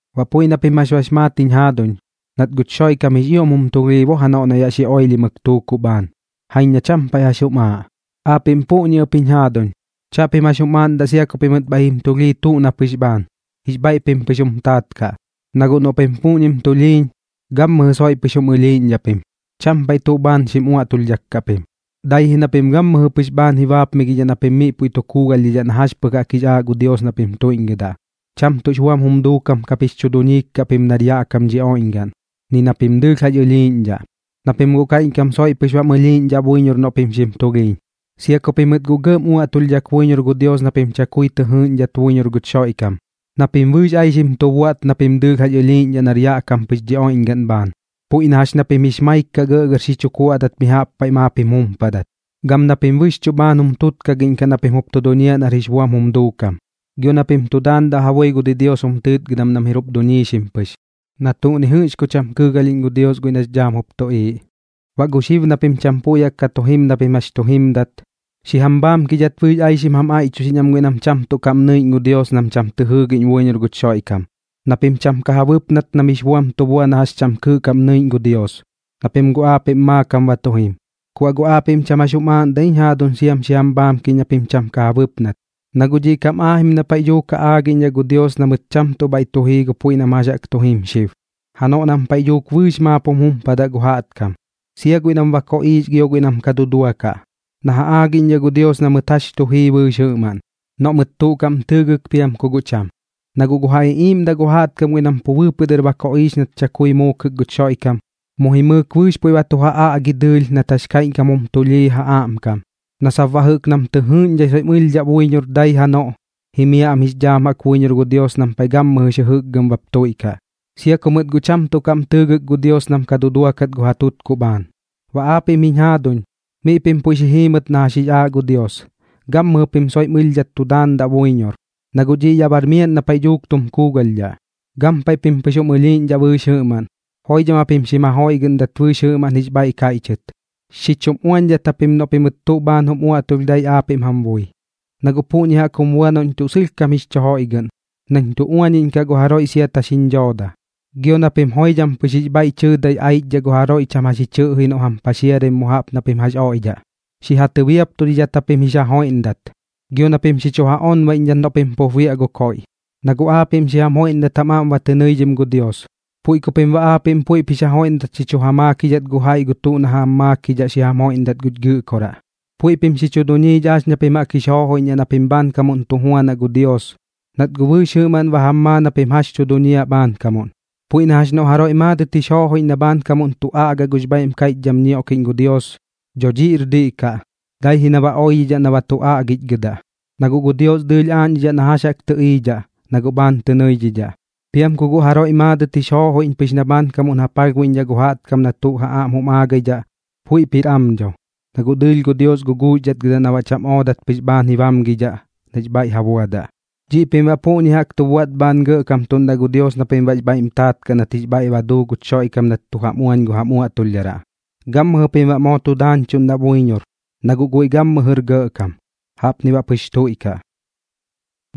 Ba puiꞌ na pim jax bax maat jiñ jaaduñ, nat guch Xoiꞌkam jix ioꞌm jum tulhii bo janoꞌ na yaꞌ xi oilhimɨk tuukuꞌ bhaan, jaiñ na cham paiꞌ jax jum aaꞌ. Aapiꞌm puꞌñi ɨp jiñ jaaduñ, chaꞌpim jax jum aaꞌndaꞌ sia pimɨt bhaiꞌ jim tulhii tuꞌ na pɨx bhaan, jix bhaiꞌ pim pɨx jum taat kaꞌ. Na guꞌ noꞌ pim puꞌñim tulhiiñ, gammɨjɨ soiꞌ pɨx jum ɨlhiiꞌñdhaꞌ pim, cham paiꞌ tuꞌ bhaan ka xim uaꞌtulhdhaꞌkaꞌ pim, dai ji na pim gammɨjɨ pɨx bhaan ji baapmigidhaꞌ na pim miꞌ puiꞌ tu kuugalhdhidhaꞌ na jax pɨx jaꞌk jix aaꞌ gu Dios na pim tuiꞌñgɨdaꞌ. Cham tuꞌx buam jum duukam kap jix chu duñiik kaꞌ pim nar yaꞌ kam dhi oiꞌñgaꞌn, ni na pim dɨɨlh jax ɨlhiiꞌñdhaꞌ, na pim guꞌ kaiꞌñkam soiꞌ pɨx bam ɨlhiiꞌñdhaꞌ buiñor noꞌ pim xim tulhiiñ. Sia ku pimɨt guꞌ gɇꞌm uaꞌtulhdhak buiñor gu Dios na pim chakui tɨ jɨɨꞌñdhat buiñor guch Xoiꞌkam, na pim bɨɨx aixim tu buaꞌt na pim dɨɨlh jax ɨlhiiꞌñdhaꞌ nar yaꞌ kam pɨx dhi oiꞌñgaꞌn bhaan, puiꞌ na jax na pim jix maik kaꞌ gɇꞌgɇr xi chu kuaꞌdat mi jaꞌp paiꞌ maap jim jumpadat, gam na pim bɨxchuꞌ bhaan jum tutkagiꞌñkaꞌ na pim jup tu duñiaꞌ nar jix buam jum duukam, gio na pim tu daandaꞌ ja bui gu didios jum tɨɨtgɨdam nam jir jup duñiixim pɨx, na tuꞌ ni jɨꞌx ku cham kɨɨgalhiꞌñ gu Dios guiꞌ nax dhaam jup tuꞌiiꞌ. Baꞌ gu xib na pim cham puiꞌ jaꞌk ka tu jim na pim jax tu jimdat, xi jam bhaamkidhat bɨɨx aixim jam aiꞌchuxiꞌñ am guiꞌ nam cham tuꞌ kaꞌm nɨiꞌñ gu Dios nam cham tɨ jɨɨgiꞌñ buiñor guch Xoiꞌkam, na pim cham ka ja bɨpnat nam jix buam tu bua na jax cham kɨɨꞌ kaꞌm nɨiꞌñ gu Dios, na pim guꞌ aapiꞌm maakam ba tu jim. Ku baꞌ guꞌ aapiꞌm cham jax jum aaꞌndaꞌ ji jiñ jaaduñ siam xi jam bhaamkiꞌñ na pim cham ka ja bɨpnat, na guꞌ dhiꞌ kam aajim na paiꞌ dhuuk ja aagiꞌñdhaꞌ gu Dios na mɨt cham tuꞌ bhaiꞌ tu jii gu puiꞌ nam jax jaꞌk tu jim xib, janoꞌ nam paiꞌ dhuuk bɨɨx maap jum jumpadaꞌ gu jaꞌtkam, sia guiꞌ nam ba koꞌiix gio guiꞌ nam ka duduakaꞌ, na ja aagiꞌñdhaꞌ gu Dios na mɨt jax tu jii bɨɨx jɨꞌmaꞌn, noꞌ mɨt tuꞌ kaꞌm tɨɨgɨk piam ku guꞌ cham. Na guꞌ gu ja iꞌiiꞌmdaꞌ gu jaꞌtkam guiꞌ nam pu bɨɨpɨꞌ dɨr ba koꞌiix nat chakui muukɨk guch Xoiꞌkam, mu jimɨɨk bɨɨx puiꞌ ba tu ja aꞌgi dɨɨlh nat jax kaiꞌñkam jum tulhii ja aꞌmkam, na sap baꞌ jɨꞌk nam tɨ jɨɨꞌñdhai soiꞌm ɨlhdhaꞌ buiñor dai janoꞌ, jimiaꞌ am jix dhaam buiñor gu Dios nam paiꞌ gammɨjɨx jɨjɨkgɨm baꞌp tuiꞌkaꞌ, sia ku mɨt guꞌ cham tuꞌ kaꞌm tɨɨgɨk gu Dios nam ka duduakat gu ja tutkuꞌ bhaan. Baꞌ aapiꞌm jiñ jaaduñ, miꞌ pim puiꞌ xi jiimɨt na jax jix aaꞌ gu Dios, gammɨjɨ pim soiꞌm ɨlhdhat tu daandaꞌ buiñor, na guꞌ dhiꞌ yaꞌ bar miaꞌn na paiꞌ dhuuk tum kuugalhdhaꞌ. Gampaiꞌ pim pɨx jum ɨlhiiꞌñdhaꞌ bɨɨx jɨꞌmaꞌn, joidham japim xim jajoiꞌgɨꞌndat bɨɨx jɨꞌmaꞌn jix bhaiꞌ kaiꞌchɨt. Xi chum uañdhat japim noꞌ pimɨt tuꞌ bhaan mam uaꞌtulh dai aapiꞌm jam bui, na guꞌ puꞌñi jaꞌk jum bua noꞌñ tuꞌ sɨlhkam jix chu joiꞌgɨꞌn, nañ tu uañiꞌñkaꞌ gu jaroiꞌ siat jax jiñ dhooda. Gio na pim joidham pɨx jix bhaiꞌ tɨɨdai aichdhaꞌ gu jaroiꞌ cham jax ji chɨꞌji noꞌ jam paxiaraim mu jaꞌp na pim jax oiꞌdhaꞌ. Xi ja tɨbiaptudidhat japim jix ja joiꞌndat, gio na pim xi chu ja onbaiꞌñdhat noꞌ pim pup biaꞌ gu koiꞌ. Na guꞌ aapiꞌm xi jam joiꞌndat jam aꞌm ba tɨ nɨidhim gu Dios, puiꞌ ku pim baꞌ aapiꞌm puiꞌp jix ja joiꞌndat xi chu ja maakidhat gu jaiꞌ gu tuꞌ na jam maakidhaꞌ xi jam joiꞌndat guch Gɨꞌkoraꞌ. Puiꞌ pim xi chu duñiidhaꞌ jax ña pim jaꞌk jix joojoiꞌñdhaꞌ na pim bhaankamuꞌn tu juanaꞌ gu Dios, nat guꞌ bɨɨx jɨꞌmaꞌn ba jam maa na pim jax tu duñiaꞌ bhaankamuꞌn. Puiꞌ na jax noꞌ gu jaroiꞌ maadɨt jix joojoiꞌñ na bhaankamuꞌn tu aꞌgaꞌ gux bhaiꞌm kaiꞌchdham ñioꞌkiꞌñ gu Dios, dho dhiꞌr diꞌ kaꞌ, dai ji na ba oidhidhaꞌ na ba tu aꞌgichgɨdaꞌ. Na guꞌ gu Dios dɨɨlh aaꞌñdhidhaꞌ na jax jaꞌk tɨꞌiidhaꞌ, na guꞌ bhaan tɨ nɨidhidhaꞌ. Piam ku guꞌ jaroiꞌ maadɨt jix joojoiꞌñ pɨx na bhaankamuꞌn ja palhbuiꞌñdhaꞌ gu jaꞌtkam gu tuꞌ na ja aꞌm jum aagaidhaꞌ, puiꞌp jir am dho, na guꞌ dɨɨlh gu Dios guguuxdhatgɨdaꞌ na baꞌ cham oodat pɨx bhaan ji bamgidhaꞌ nax bhaiꞌ ja buadaꞌ. Dhiꞌ pim baꞌ puꞌñi jaꞌk tu buaꞌt bhaan gɇꞌkamtuꞌndaꞌ gu Dios na pim jix bhaiꞌm taat kaꞌ nat jix bhaiꞌ duu guch Xoiꞌkam nat tu jam uañ gu jam uaꞌtulhdharaꞌ. Gammɨjɨ pim baꞌ moo tu daañchuꞌndaꞌ buiñor, na guꞌ guiꞌ gammɨjɨr gɇꞌkam. Jaꞌpni baꞌ pɨx tuiꞌkaꞌ.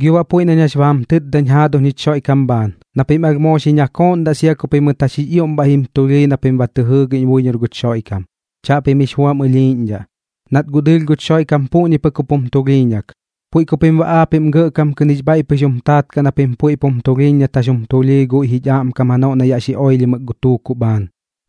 Gio baꞌ puiꞌ nañ jax ba jam tɨtdañ jaaduñ jich Xoiꞌkam bhaan, na pim alh moo xi chu nakooꞌndaꞌ sia ku pimɨt jax jix ioꞌm bhaiꞌ jim tulhii na pim ba tɨ jɨɨgiꞌñ buiñor guch Xoiꞌkam. Chaꞌpim jix buam ɨlhiiꞌñdhaꞌ, nat guꞌ dɨɨlh guch Xoiꞌkam puꞌñi pɨk jup jum tulhiiñak. Puiꞌ ku pim baꞌ aapiꞌm gɇꞌkam kɨꞌn jix bhaiꞌ pɨx jum taat kaꞌ na pim puiꞌp jum tulhiiñ nat jax jum tulhii guiꞌ jich aꞌmkam janoꞌ na yaꞌ xi oilhimɨk gu tuukuꞌ bhaan,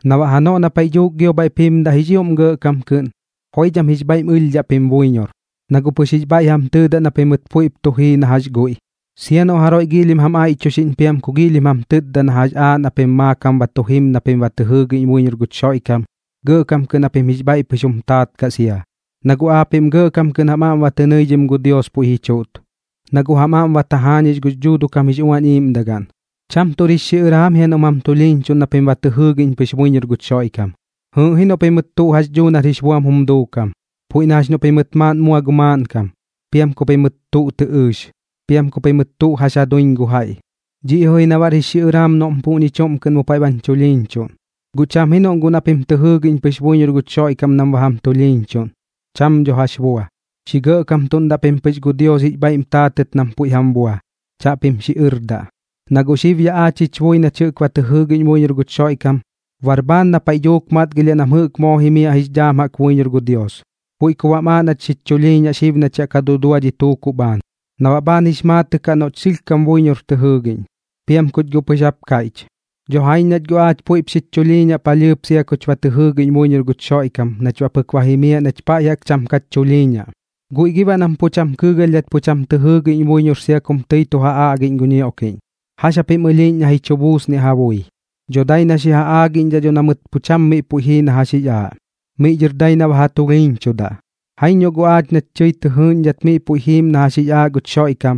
na baꞌ janoꞌ na paiꞌ dhuuk gio bhaiꞌp jimdaꞌ jix ioꞌm gɇꞌkam kɨꞌn, joidham jix bhaiꞌm ɨlhdhaꞌ pim buiñor, na guꞌ pɨx jix bhaiꞌ jam tɨɨdaꞌ na pimɨt puiꞌp tu jii na jax guiꞌ. Sia noꞌ jaroiꞌ giilhim jam aiꞌchuxiꞌñ piam ku giilhim jam tɨtda na jax aaꞌ na pim maakam ba tu jim na pim ba tɨ jɨɨgiꞌñ buiñor guch Xoiꞌkam, gɇꞌkam kɨꞌn japim jix bhaiꞌ pɨx jum taat kaꞌ sia, na guꞌ aapiꞌm gɇꞌkam kɨꞌn jam aꞌm tɨ nɨidhim gu Dios puiꞌ ji chuꞌt, na guꞌ jam aꞌm ba tajaañix gux Dhuuduꞌ kam jix Uañ Iiꞌmdagaꞌn. Cham tuꞌr jix xiꞌɨraam jia noꞌm jam tulhiiñchuꞌn na pim ba tɨ jɨɨgiꞌñ pɨx buiñor guch Xoiꞌkam. Jɨɨꞌ ji noꞌ pimɨt tuꞌ jax dhuu nar jix buam jum duukam, puiꞌ na jax noꞌ pimɨt maaꞌn mua gu maaꞌnkam, piam ku pimɨt tuꞌ tɨ ɨɨx, piam ku pimɨt tuꞌ jax ja duiñ gu jaiꞌ. Dhiꞌ ji na baꞌr jix xiꞌɨraam noꞌm puꞌñi chuꞌm kɨꞌn mu paiꞌ bañ chulhiiñchuꞌn. Guꞌ cham ji noꞌ guꞌ na pim tɨ jɨɨgiꞌñ pɨx buiñor guch Xoiꞌkam nam ba jam tulhiiñchuꞌn, cham dho jax bua. Xi gɇꞌkamtuꞌndaꞌ pim pɨx gu Dios jix bhaiꞌm taatɨt nam puiꞌ jam bua, chaꞌpim xiꞌɨrdaꞌ. Na guꞌ xib yaꞌ aach jich bui nach jɨꞌk ba tɨ jɨɨgiꞌñ buiñor guch Xoiꞌkam, bar bhaan na paiꞌ dhuuk matgilhiaꞌ nach jɨꞌk moo jimiaꞌ jix dhaam jaꞌk buiñor gu Dios. Puiꞌ ku baꞌm aaꞌ nach jich chulhiiñaꞌ xib nach yaꞌ ka dudua dhi tutkuꞌ bhaan, na baꞌ bhaan jix maatɨꞌ kaꞌ noꞌch sɨlhkam buiñor tɨ jɨɨgiꞌñ, piam kuch guꞌ pɨx jap kaiꞌch. Dho jaiñ nach guꞌ aach puiꞌp xich chulhiiñaꞌ palhɨɨp sia kuch ba tɨ jɨɨgiꞌñ buiñor guch Xoiꞌkam nach baꞌ pɨk ba jimiaꞌ nach paiꞌ jaꞌk cham kach chulhiiñaꞌ. ¿Guiꞌ gi baꞌ nam pu cham kɨɨgalhdhat pu cham tɨ jɨɨgiꞌñ buiñor sia kum tɨi tu ja aꞌgiꞌñ gu ñioꞌkiꞌñ, jax japim ɨlhiiꞌñ na ji chu buusniaꞌ ja bui? Dho dai na xi ja aagiꞌñdhaꞌ dho na mɨt pu cham miꞌ puiꞌ jii na jax jix aaꞌ, miꞌ dhɨr dai na ba ja tulhiiñchudaꞌ. Jaiñ noꞌ guꞌ aach nach tɨi tɨ jɨɨꞌñdhat miꞌ puiꞌ jiim na jax jix aaꞌ guch Xoiꞌkam,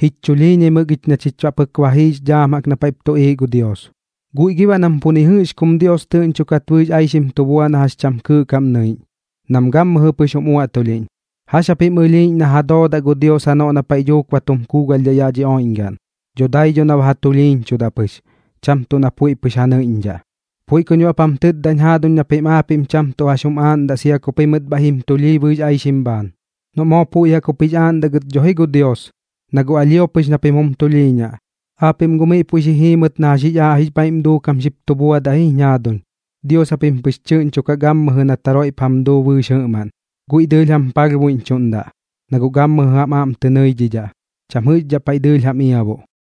jich chulhiiñaimɨk ich na chich baꞌ pɨk ba jiix dhaam na paiꞌp tuꞌiiꞌ gu Dios. ¿Guiꞌ gi baꞌ nam pu ni jɨꞌx kum Dios tɨꞌñchokat bɨɨx aixim tu bua na jax cham kɨɨꞌ kaꞌm nɨiꞌñ, nam gammɨjɨ pɨx jum uaꞌtulhiꞌñ, jax japim ɨlhiiꞌñ na ja doodaꞌ gu Dios janoꞌ na paiꞌ dhuuk ba tum kuugalhdhaꞌ yaꞌ dhi oiꞌñgaꞌn? Dho dai dho na ba ja tulhiiñchudaꞌ pɨx, cham tuꞌ na puiꞌ pɨx ja nɨiꞌñdhaꞌ. Puiꞌ kuñ baꞌp jam tɨtdañ jaaduñ na pim aapiꞌm cham tuꞌ jax jum aaꞌndaꞌ sia ku pimɨt bhaiꞌ jim tulhii bɨɨx aixim bhaan, noꞌ guꞌ moo puiꞌ jaꞌk jup jix aaꞌndaꞌ gɨt dho ji gu Dios, na guꞌ alhio pɨx na pim jum tulhiiñaꞌ. Aapiꞌm guꞌ miꞌ puiꞌ xi jiimɨt na jax jix aaꞌ jix bhaiꞌm duukam xip tu buadaꞌ ji jiñ jaaduñ, Dios japim pɨx tɨꞌñchokaꞌ gammɨjɨ nat jaroiꞌp jam duu bɨɨx jɨꞌmaꞌn. Guiꞌ dɨɨlh jam palhbuiꞌñchuꞌndaꞌ, na guꞌ gammɨjɨ jam aꞌm tɨ nɨidhidhaꞌ, cham jɨꞌxdhaꞌ paiꞌ dɨɨlh jam iabuꞌ.